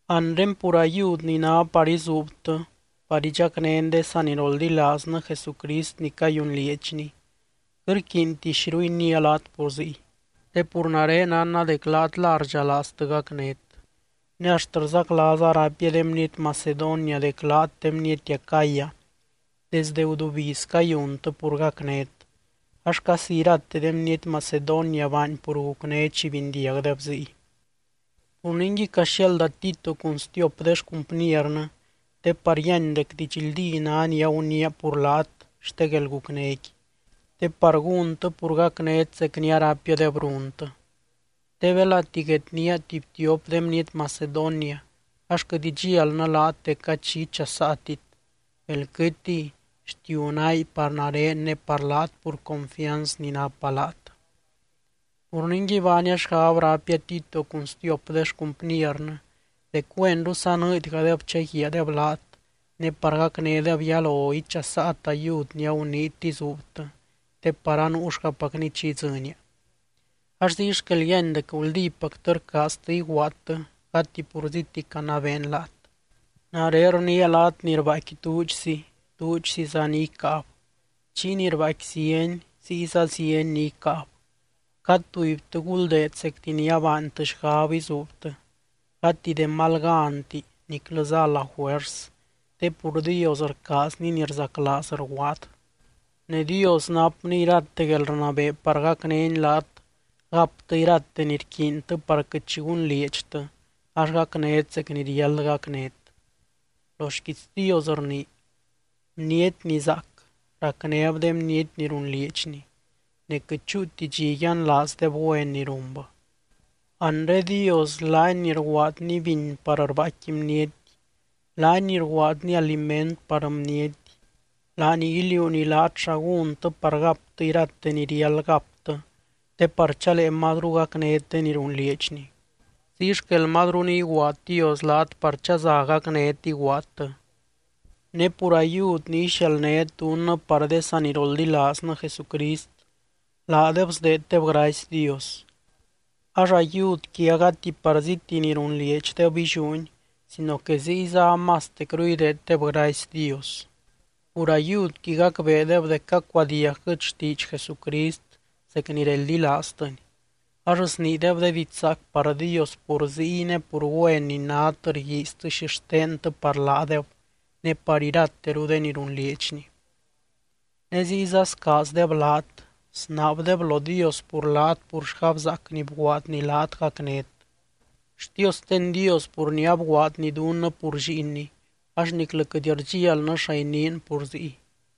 Anre pur ayud ni ná par izuubtɨ par idxacnén de saniroldilaaznɨ Jesucrist ni cayunlieedxni, quɨt rquiinti xiru iniia laat pur ziy, te pur nare nánna dec laat la rdxalaaztɨ gacnét. Ne axt rzaclaaza raipia de bniety Macedonia dec laat de bniety Acaya desde gudubiz cayuntɨ pur gacnét, ax casi irate de bniety Macedonia baany pur gucné chi bindiagdeb ziy. Pur ningui caxiaalda Tito cun stiop de xcumpniernɨ te par yíany dec didxldí ná ni aguniia pur laat xte guelgucnéqui, te par gúntɨ pur gacnét zec ni araipiadeb runtɨ. Te belati guednía tuby tiop de bniety Macedonia ax quɨt idxialnɨ laat dec gady xi ichasaatit, bel quɨtiy, xtiu náy par nare ne par laat pur confianz ni napa laat. Pur ningui baania xgab raipia Tito cun stiop de xcumpiernɨ dec güenru sanɨɨdgadeb chaguiaadeb laat, ne par gacnédeb yalo ichasaat ayud ni aguniit izuubtɨ te par anuuxgapacni chi idzɨnia. Ax ziy xquel yíany dec guldípactɨ rcaaztɨ iguaadtɨ gati purzíti canabeen laat. Nare rniia laat ni rbaaicqui duudxzi, duudxziza ni icáab, chiy ni rbaaicqui zieny, ziyza zieny ni icáab. Cad tubytɨ guldeed zecti ni abaantɨ xgab izuubtɨ, gati de mal ganti niclɨza a la juers, te pur Dios rcaazny ni rzaclaaz rguaad. Ne Dios napny irate guelrnabee par gacnény laat gaptɨ irate ni rquiintɨ par quɨt xi gunlieedxtɨ ax gacnét zec chi riáld gacnét. Lo xquiits Dios rnii: Bniety ni zaac, racnéb de bniety ni runlieedxni, ne quɨt chúuti dxi yianlaazdeb güen ni runbɨ. Anre Dios laany ni rguaadny biny par rbaaicqui bniety, laany ni rguaadny aliment par bniety, laany iliuuny laat xa gúntɨ par gaptɨ irate ni riáld gaptɨ, te par chalee mazru gacnét de ni runlieedxni. Ziy xquel mazru ni iguaad Dios laat par chaza gacnét iguaadtɨ. Ne pur ayud ni ixialdnét dunnɨ par de saniroldilaaznɨ Jesucrist, laadeb sdeeddeb gracy Dios. Ax ayudqui a gati parzíti ni runlieedxdeb illiúni sino que ziyza amastecru ideeddeb gracy Dios. Pur ayudqui gacbeedeb dec cacuadiagquɨt xtiidx Jesucrist zec ni reldilaaztɨny ax sniideb de diidx zaac par Dios pur ziy, ne pur güen ni nát rguiiztɨ xixtentɨ par laadeb ne par irateru de ni runlieedxni. Ne ziyza scaazdeb laat, snaabdeb lo Dios pur laat pur xgabzaac ni bguaadny laat gacnét. ¡Xtiosten Dios pur ni abguaadny dunnɨ pur Lliinny axt niclɨ quɨt rdxialnɨ xa iniin pur ziy!